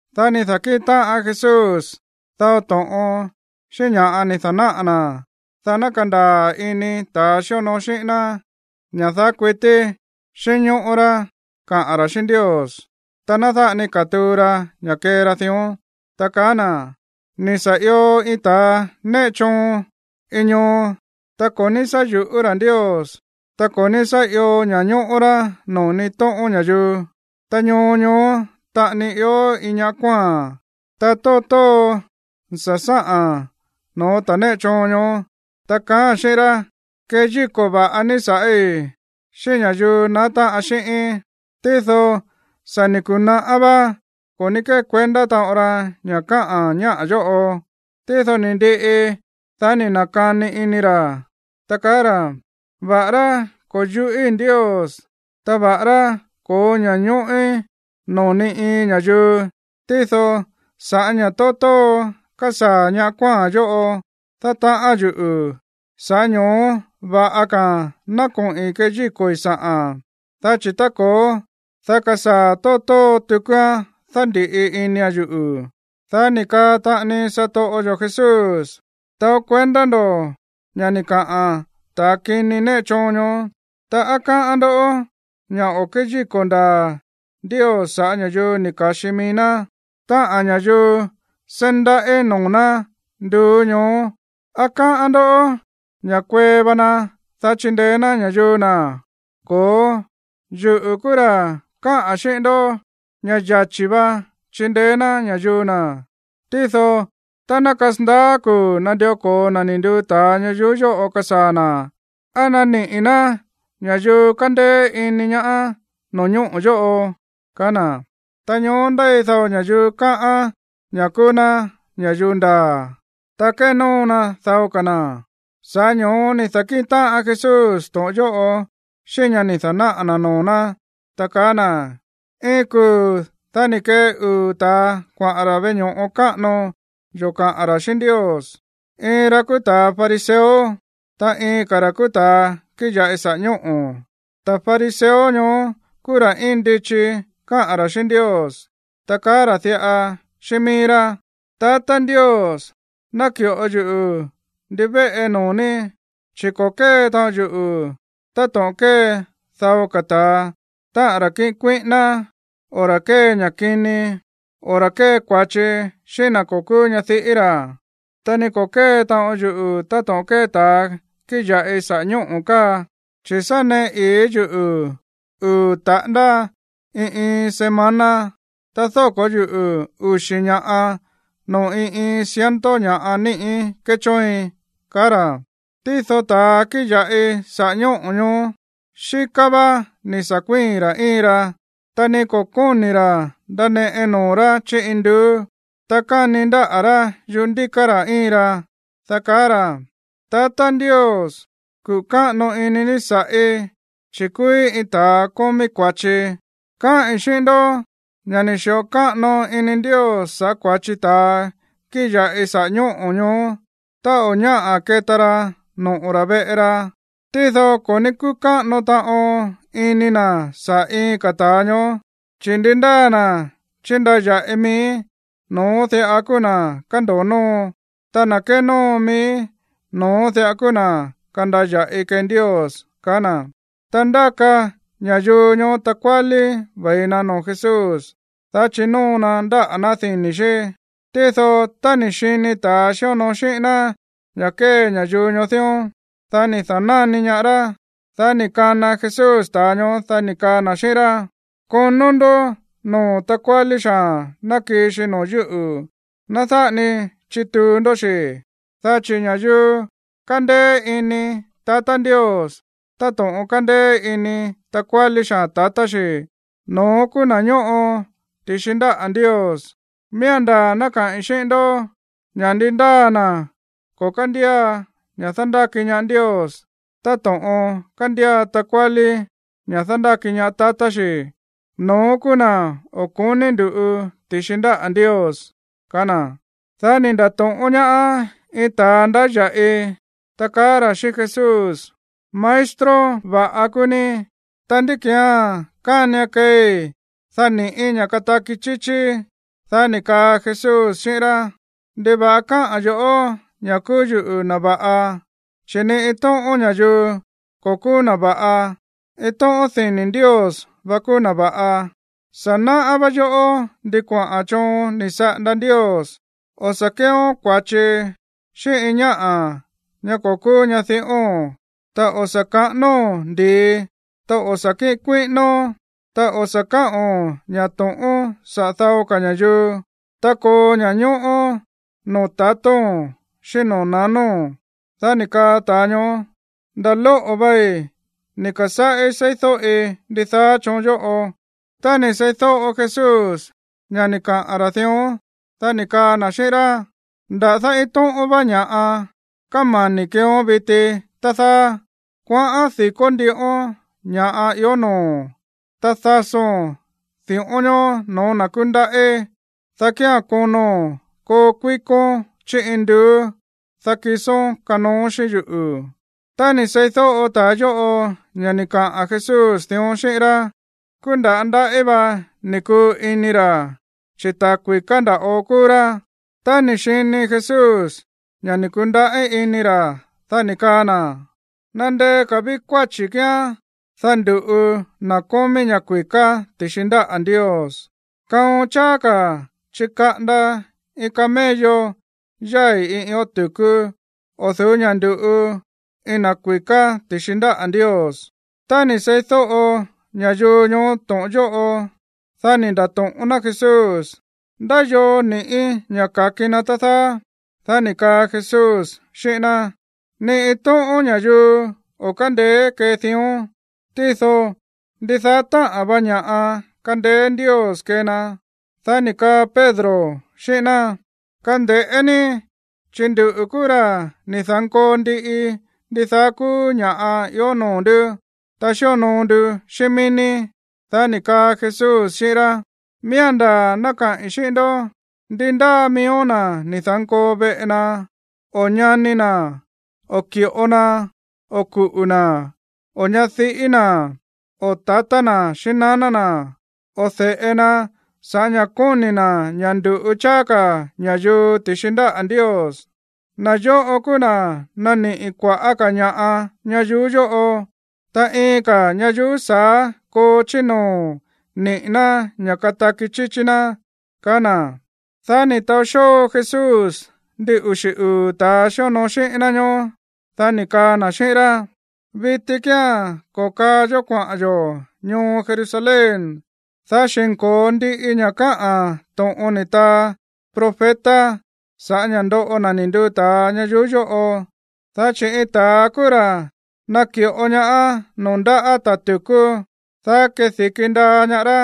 Dá ni̱ da̱kíꞌin táꞌan Jesús dao to̱ꞌon xíꞌín ña̱ ni̱ da̱náꞌa̱ na̱, dá ná kandaa̱ ini ta̱a xíonoo xíꞌín ná ña̱ daá kuití xínñóꞌó rá kaꞌa̱n ra̱ xíꞌín Ndios, ta ná dáꞌa ni katuu ra ña̱ kee ra dión, ta kaá na̱: ―Ni̱ sa̱ io iin ta̱a néꞌe choon iin ñoo, ta ko̱ ní sá yu̱ꞌú ra̱ Ndios, ta ko̱ ní sá io ña̱ñóꞌó rá noo̱ ni iin tóꞌón ña̱yuu. Ta ñoo ñoó taꞌani ió iin ñáꞌa̱ kuáa̱n. Ta tóo tóo sa̱ sáꞌa̱n no̱ó ta̱ néꞌe choon ñoó, ta kaáa̱n xíꞌín rá: “Keyíko̱ va̱ꞌa ní sa̱ꞌí xíꞌín ña̱yuu naá táꞌan xíꞌíín.” Tído sa̱ ni̱ ku̱naꞌá vá ko̱ ní kékuendá taꞌon ra ña̱ káꞌa̱n ñáꞌa̱ yóꞌo. Tído ni̱ ndiꞌi, dá ni̱ na̱kani ini ra̱, ta kaá ra̱: “Va̱ꞌará ko̱ yuꞌíi̱ Ndios, ta va̱ꞌará ko̱ó ña̱ñóꞌín noo̱ ni iin ña̱yuu, tído sa̱ꞌá ña̱ tóo tóo kásaa̱ ñá kuáa̱n yóꞌo dátaꞌán yuꞌu̱, sa̱ꞌá ño̱ó va̱ꞌa ka̱a̱n ná koꞌi̱n keyíko̱i̱ sa̱ꞌa̱n. Dá chi̱ tá ko̱ó, dá kasaa̱ tóo tóo tukuán dándíꞌi inia̱n yuꞌu̱.” Dá ni̱ kaa taꞌani satoꞌo yo̱ Jesús: ―Taó kuendá ndo̱ ña̱ ni̱ kaꞌa̱n ta̱a kini néꞌe choon ñoó. Ta, ¿á káꞌán ndó ña̱ o̱ kéyíko̱ ndaa̱ Ndios sa̱ꞌá ña̱yuu ni̱ ka̱xi mií ná, táꞌa̱n ña̱yuu seí ndaꞌí noo̱ ná nduú ñoó? ¿Á káꞌán ndó ña̱ kueé va na, dá chindeé ná ña̱yuu na̱? Ko̱ó. Yuꞌu̱ kúú ra̱ káꞌa̱n xíꞌín ndó ña̱ yachi̱ va chindeé ná ña̱yuu na̱. Tído tá ná kasandaá kuu̱ nandió ko̱o na̱ ni̱ nduu ta̱a ñayuú yóꞌo kasaa̱ na̱, ¿á naniꞌi̱ ná ña̱yuu kándéé ini ñaá no̱ñóꞌo̱ yóꞌo? ―kaá na̱. Ta ñoó ndéi dao ña̱yuu káꞌán ña̱ kúú ná ña̱yuu ndaa̱, ta kénóo na dao ka̱ na̱. Sa̱ꞌá ño̱ó ni̱ da̱kíꞌin táꞌan Jesús to̱ꞌon yóꞌo xíꞌín ña̱ ni̱ da̱náꞌa̱ na̱ noo̱ ná, ta kaá na̱: ―Iin kuu̱ dá ni̱ kee uu̱ ta̱a kuaꞌa̱n ra̱ veꞌe ño̱ꞌo káꞌano yó kaꞌa̱n ra̱ xíꞌín Ndios. Iin ra̱ kúú ta̱ fariseo, ta iin ka̱ ra̱ kúú ta̱a kíꞌin ya̱ꞌi saꞌa̱ ñóꞌo̱. Ta̱ fariseo ñoó kúú ra̱ íin ndichi káꞌa̱n ra̱ xíꞌín Ndios, ta kaá ra̱ diꞌa xíꞌín mií rá: “Tatá Ndios, náki̱ꞌo yuꞌu̱ ndivéꞌe noo̱ ní, chi̱ ko̱ kée taꞌon yuꞌu̱ táto̱ꞌon kée dao ka̱ ta̱a, táꞌa̱n ra̱ kíꞌin kuíꞌíná, o ra̱ kée ña̱ kini, o ra̱ kée kua̱chi xíꞌín na̱ ko̱ kúú ñadiꞌí ra̱. Ta ni ko̱ kée taꞌon yuꞌu̱ táto̱ꞌon kée ta̱a kíꞌin ya̱ꞌi saꞌa̱ ñóꞌo̱ káa. Chi̱ sa̱ néꞌe ii̱ yuꞌu̱ uu̱ taꞌándá iin iin semana, ta dóko̱ yuꞌu̱ uxi̱ ña̱ꞌa noo̱ iin iin ciento ña̱ꞌa níꞌí kéchóoin”, kaá ra̱. Tído ta̱a kíꞌin ya̱ꞌi saꞌa̱ ñóꞌo̱ ñoó, xíká vá ni̱ sa̱ kuíi̱n ra̱ íin ra. Ta ni ko̱ kóni̱ ra̱ ndaneꞌe noo̱ rá chí induú. Ta káni ndáꞌa̱ rá yuꞌú ndíká ra̱ íin ra, dá kaá ra̱: “Tatá Ndios, kuꞌu̱ káꞌano ini ní sa̱ꞌí, chi̱ kúúí iin ta̱a kómí kua̱chi.” Káꞌi̱n xíꞌín ndó ña̱ ni̱ xi̱ꞌo káꞌano ini Ndios sa̱ꞌá kua̱chi ta̱a kíꞌin ya̱ꞌi saꞌa̱ ñóꞌo̱ ñoó tá o̱ ñáꞌa̱ keta ra noꞌo̱ ra̱ veꞌe ra. Tído ko̱ ní kúꞌu̱ káꞌano taꞌon ini na̱ saꞌa̱ iin ka̱ ta̱a ñoó. Chi̱ ndi ndáa na̱ chíndaya̱ꞌi mií, no̱ón diꞌa kúú na̱ kando̱o nóo. Ta na̱ kénóo mií, no̱ón diꞌa kúú na̱ kandaya̱ꞌi kee Ndios ―kaá na̱. Ta ndáka ña̱yuu ñoó takuálí ve̱i na noo̱ Jesús, dá chinóo na ndáꞌa̱ ná dini̱ xí. Tído tá ni̱ xini ta̱a xíonoo xíꞌín ná ña̱ kée ña̱yuu ñoó dión, dá ni̱ da̱náni ñaá rá. Dá ni̱ kana Jesús ta̱a ñoó, dá ni̱ kaa na̱ xíꞌín rá: ―Konó ndó noo̱ takuálí xaa̱n ná kii xi noo̱ yúꞌu̱. Ná dáꞌa ni chituu ndó xi̱. Dá chi̱ ña̱yuu kándéé iní tatá Ndios táto̱ꞌon kándéé ini takuálí xaa̱n tatá xi, no̱ón kúú na̱ ñóꞌo ti̱xi ndáꞌa̱ Ndios. Miía̱n ndaa̱ ná kaꞌi̱n xíꞌín ndó ña̱ ndi ndáa na̱ ko̱ kándía ña̱ dándáki ñaá Ndios táto̱ꞌon kándía takuálí ña̱ dándáki ñaá tatá xi̱, no̱ón kúú na̱ o̱ ko̱ní ndu̱ꞌu ti̱xi ndáꞌa̱ Ndios ―ka̱á na̱. Dá ni̱ nda̱to̱ꞌón ñaá iin ta̱a ndáya̱ꞌi, ta kaá ra̱ xíꞌín Jesús: ―Maestro va̱ꞌa kúú ní. Ta, ¿ndí ki̱án kánian keei, dá ni̱ꞌí ña̱ kataki chíchíí? Dá ni̱ kaa Jesús xíꞌín rá: ―¿Ndiva̱ꞌa káꞌa̱n yo̱ꞌó ña̱ kúú yuꞌu̱ na̱ va̱ꞌa? Chi̱ ni iin tóꞌón ña̱yuu ko̱ kúú na̱ va̱ꞌa. Iin tóꞌón dini̱ Ndios vá kúú na̱ va̱ꞌa. Sa̱ náꞌá vá yoꞌó ndi kuaꞌa̱n choon ni̱ saꞌanda Ndios: o̱ sa̱ kéeón kua̱chi xíꞌín iin ñáꞌa̱ ñá ko̱ kúú ñadiꞌóo̱n, ta o̱ sa̱ kaꞌánóo̱n ndi̱i, ta o̱ sa̱ kíꞌin kuíꞌínón, ta o̱ sa̱ káꞌo̱n ña̱ to̱ꞌón saꞌa̱ dao ka̱ ña̱yuu, ta koo ña̱ñóꞌó noo̱ tatóo̱n xíꞌín noo̱ nanóo̱n. Dá ni̱ kaa ta̱a ñoó: ―Nda̱ lóꞌo̱ vei ni̱ ka̱sáꞌí seídóꞌi ndidaá choon yóꞌo. Tá ni̱ seídóꞌo Jesús ña̱ ni̱ kaꞌa̱n ra̱ dión, dá ni̱ kaa na̱ xíꞌín rá: ―Nda̱dá iin tóꞌón vá ña̱ꞌa kámani̱ keeón viti, tá dáá. Kuaꞌán di̱kó ndíꞌón ña̱ꞌa ió noo̱o̱n. Ta dasóo̱n di̱ꞌón ñoó no̱ó na̱ kúndaꞌí, dá kía̱n kono̱n koo kuíkón chí induú. Dá kisón kanooón xíꞌín yuꞌu̱. Tá ni̱ seídóꞌo ta̱a yóꞌo ña̱ ni̱ kaꞌa̱n Jesús dión xíꞌín rá, kúú nda̱á ndaꞌí va ni̱ kuu ini ra̱, chi̱ ta̱ kui̱ká nda̱ꞌo kúú rá. Tá ni̱ xini Jesús ña̱ ni̱ ku̱ndaꞌí ini ra̱, dá ni̱ kaa na̱: ―¡Nandeé ka̱ ví kuáchi̱ kíán, dá ndu̱ꞌu na̱ kómí ña̱ kui̱ká ti̱xi ndáꞌa̱ Ndios! Kaon cháá ka̱ chikaꞌanda iin camello yái̱ iin ión tu̱kú o̱ du̱ú ña̱ ndu̱ꞌu iin na̱ kui̱ká ti̱xi ndáꞌa̱ Ndios. Tá ni̱ seídóꞌo ña̱yuu ñoó to̱ꞌon yóꞌo, dá ni̱ nda̱to̱ꞌón ná Jesús: ―¿Ndá yoo ni̱ꞌí ña̱ ka̱ki na, tá dáá? Dá ni̱ kaa Jesús xíꞌín ná: ―Ni iin tóꞌón ña̱yuu o̱ kándeé kee dión, tído ndidaá táꞌa̱n va ña̱ꞌa kándéé Ndios kee na. Dá ni̱ kaa Pedro xíꞌín ná: ―Kande̱ꞌé ní, chi̱ nduꞌu̱ kúú ra̱ ni̱ da̱nkoo ndiꞌi ndidaá kúú ña̱ꞌa ió noo̱ ndú, ta xíonoo nduꞌu̱ xíꞌín mií ní. Dá ni̱ kaa Jesús xíꞌín rá: ―Miía̱n ndaa̱ ná kaꞌi̱n xíꞌín ndó; ndi ndáa miíó na̱ ni̱ da̱nkoo veꞌe na, o ñani na̱, o ki̱ꞌo na, o kuꞌu̱ na̱, o ñadiꞌí na̱, o tatá na̱ xíꞌín naná na̱, o de̱ꞌe na sa̱ꞌá ña̱ kóni̱ na̱ ña̱ ndu̱ꞌu cháá ka̱ ña̱yuu ti̱xi ndáꞌa̱ Ndios, na̱ yóꞌo kúú na̱ naniꞌi̱ kua̱ꞌá ka̱ ña̱ꞌa ñayuú yóꞌo. Ta iin ka̱ ñayuú sa̱á koo chí noo̱ niꞌi̱ ná ña̱ kataki chíchí ná ―kaá na̱. Dá ni̱ taó xóo Jesús ndin uxi̱ uu̱ ta̱a xíonoo xíꞌín ná ñóó. Dá ni̱ kaa na̱ xíꞌín rá: ―Viti kía̱n ko̱kaa yó kuaꞌa̱n yo̱ ñoo Jerusalén, dá xi̱nko̱o ndiꞌi ña̱ káꞌa̱n to̱ꞌon ni̱ taa profeta sa̱ꞌá ña̱ ndoꞌo na̱ ni̱ nduu ta̱a ña̱yuu yóꞌo. Dá chi̱ iin ta̱a kúú ra̱ naki̱ꞌo ñaá noo̱ ndáꞌa̱ ta̱ tu̱kú, dá kedi̱ki ndaa ñaá rá.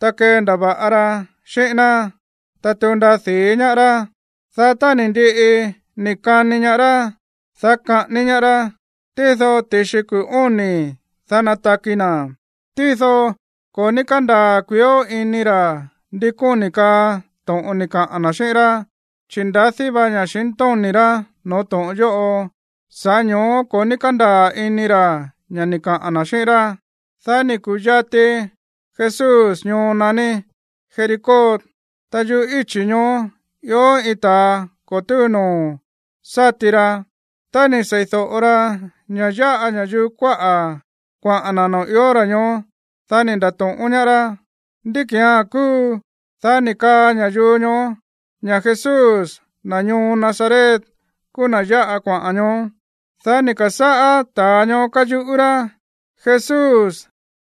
Ta kendava̱ꞌa ra xíꞌín ná. Ta tuu ndaa di̱í ñaá rá. Dá tá ni̱ ndiꞌi ni̱ kani ñaá rá, dá kaꞌání ñaá rá. Tído ti̱xi kuu̱ óni̱, dá nataki na̱. Tído ko̱ ní kándaa̱ kuiíó ini ra̱ ndi kóni̱ kaa to̱ꞌon ni̱ kaꞌa̱n na̱ xíꞌín rá, chi̱ ndadí va ña̱xintóni̱ rá no̱ó to̱ꞌon yóꞌo, sa̱ꞌá ño̱ó ko̱ ní kándaa̱ ini ra̱ ña̱ ni̱ kaꞌa̱n na̱ xíꞌín rá. Dá ni̱ ku̱yati Jesús ñoo naní Jericó, ta yuꞌú íchi̱ ñoó ió iin ta̱a ko̱ túu noo̱ sáti ra. Tá ni̱ sei̱do̱ꞌo ra ña̱ yáꞌa ña̱yuu kuáꞌa̱ kuaꞌa̱n na̱ noo̱ ió ra̱ ñoó, dá ni̱ nda̱to̱ꞌón ñaá rá: ―¿Ndí ki̱án kúu? Dá ni̱ kaa ña̱yuu ñoó ña̱ Jesús, na̱ ñoo Nazaret, kúú na̱ yáꞌa kuaꞌa̱n ñoó. Dá ni̱ ka̱sáꞌá ta̱a ñoó káyuꞌú rá: ―¡Jesús,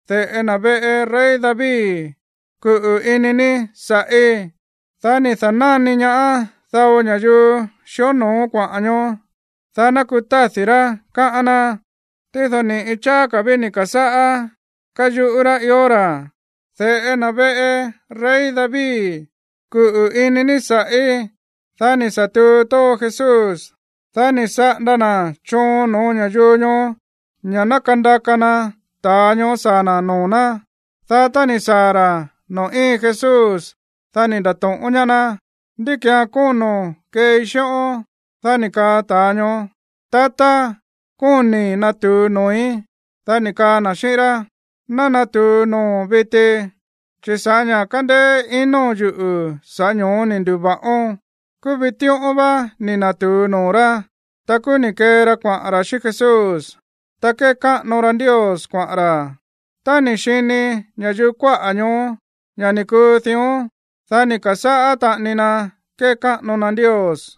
de̱ꞌe na̱ veꞌe rey David, kuꞌu̱ ini ní sa̱ꞌí! Dá ni̱ da̱náni ñaá dao ña̱yuu xíonoo kuaꞌa̱n ñoó, dá ná kutádi̱ rá, káꞌán ná. Tído ni̱ꞌi cháá ka̱ ví ni̱ ka̱sáꞌá káyuꞌú rá ió ra̱: ―¡De̱ꞌe na̱ veꞌe rey David, kuꞌu̱ ini ní sa̱ꞌí! Dá ni̱ sa̱ tuu tóo Jesús, dá ni̱ saꞌanda na̱ choon no̱ó ña̱yuu ñoó ña̱ ná kandaka na ta̱a ñoó saa̱ na̱ noo̱ ná. Dá tá ni̱ saa̱ ra̱ noo̱ íin Jesús, dá ni̱ nda̱to̱ꞌón ñaá ná: ―¿Ndí ki̱án kóno̱n keei xíꞌón? Dá ni̱ kaa ta̱a ñoó: ―Tatá, kóni̱ natu̱u noo̱í. Dá ni̱ kaa na̱ xíꞌín rá: ―Ná natu̱u noo̱o̱n viti, chi̱ sa̱ꞌá ña̱ kándéé ino̱n yuꞌu̱, sa̱ꞌá ño̱ó ni̱ ndu̱va̱ꞌón. Kúú vitíꞌón vá ni̱ na̱tu̱u noo̱ rá. Ta kúú ni̱ kee ra kuaꞌa̱n ra̱ xíꞌín Jesús, ta kékáꞌano ra Ndios kuaꞌa̱n ra̱. Tá ni̱ xini ña̱yuu kuáꞌa̱ ñoó ña̱ ni̱ kuu dión, dá ni̱ ka̱sáꞌá taꞌani na kékáꞌano na Ndios.